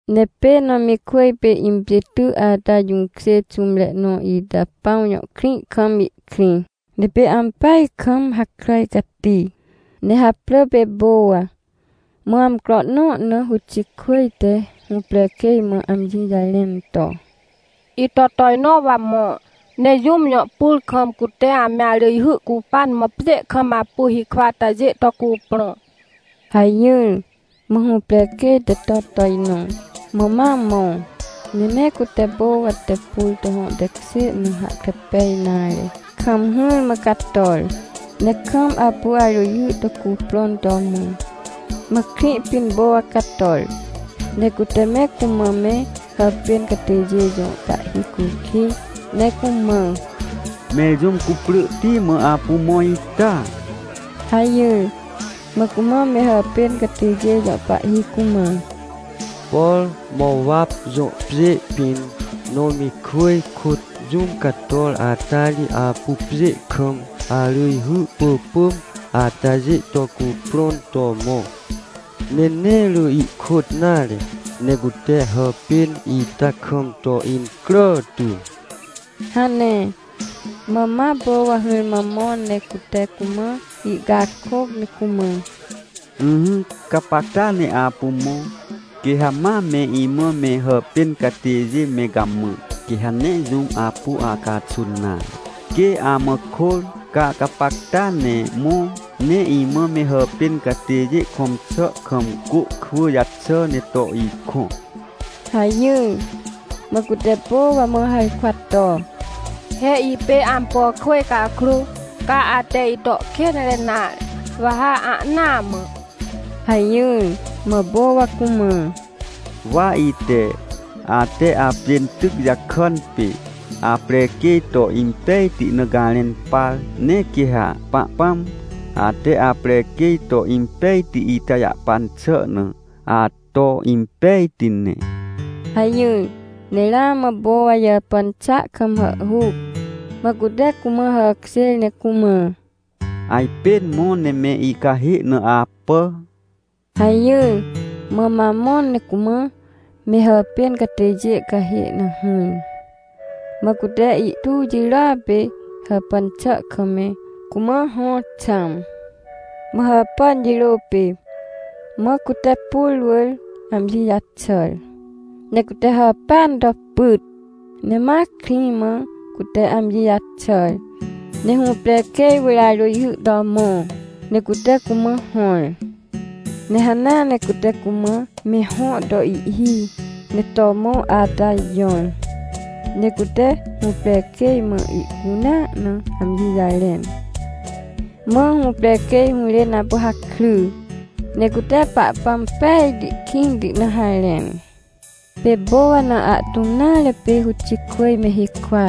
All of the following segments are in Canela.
Ne pê Nomikwỳj pê impjê ty ata jũkjê xũmre nõ ita Pãw jõ krĩ kam ihkrĩ, ne pê ampeaj kam hakràj cati, ne haprỳ pê Powa. Mã amcro nõ na Rutikwỳj te hũprequêj mã amji jarẽn to: — Ito tojnõ wa mõ, ne jũm jõ pur kam, cute ame arỳjhy cupan mã pjê kam apu hikwa atajê to cuprõ — hajỹr. Mã hũprequêj te to tojnõ, mã ma mõ, ne nee cute Powa te pur to hõ tekjê na hahkre pej nare kam hỹrmã cator, ne kam apu arỳjhy to cuprõn to mõ. Mã krĩ pĩn Powa cator, ne cute me cumã me hàpên catêjê jõ pahhi cukij, ne cumã: — Mẽr jũm cuprỳhti mã apu mõ ita? — hajỹr. Mã cumã me hàpên catêjê jõ pahhi cumã: — Por Mowap jõ pjê pĩn, Nomikwỳj kôt jũm cator ata ri apu pjê kam arỳjhy pỳpỳm atajê to cuprõn to mõ. Ne nee rỳ ihkôt nare, ne cute hàpên ita kam to incrà tu — hane. Mã ma Powa hỹrmã mõ ne cute cumã ihcakôc ne cumã: — Ỹhỹ, gapacta ne apu mõ. Quê ha ma me imã me hàpên catêjê me gamã, quê ha nee jũm apu acaxun nare. Quê amã kôr, ca gapacta ne mõ, ne imã me hàpên catêjê kõm xà kam côkwỳ jaxà ne to ikõ — hajỹr. Mã cute Powa mã harkwa to: — He ipê ampo kwỳj cakrô, ca ate ito kênre nare, wa ha ahnaa mã — hajỹr. Mã Powa cumã: — Wa ite, ate apjên tyc jakàn pê aprequêj to impejti na garẽn par. Ne quê ha Pahpãm, ate aprequêj to impejti ita jahpan xà na, ato impejti ne — hajỹr. Ne ramã Powa jàpàn xàa kam hàhhuc, mã cute cumã hàkjêr ne cumã: — Ajpên mõ ne me icahê na apà — hajỹr. Mã ma mõ ne cumã me hàpên catêjê cahê na hỹr. Mã cute ihtu jirôa pê hàpàn xà kam me cumã hõ xãm. Mã hàpàn jirô pê, ma cute pur wỳr amji jaxàr, ne cute hàpêan to pyt. Ne ma krĩ mã cute amji jaxàr, ne hũprequêj wỳr arỳjhy to mõ, ne cute cumã hõr. Ne hanea ne cute cumã me hõ to ihhi, ne to mõ ata jõr. Ne cute hũprequêj mã ihcunea na amji jarẽn, mã hũprequêj hũrên apu hakry, ne cute Pahpãm pejti kĩnti na harẽn. Pê Powa na ahtũm nare pê Rutikwỳj me hikwa.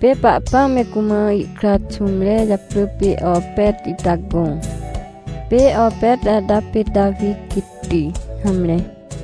Pê Pahpãm me cumã ihkra xũmre japrỳ pê Opet ita gõ. Pê Opet ata pê Tawi quêtti. Hamre.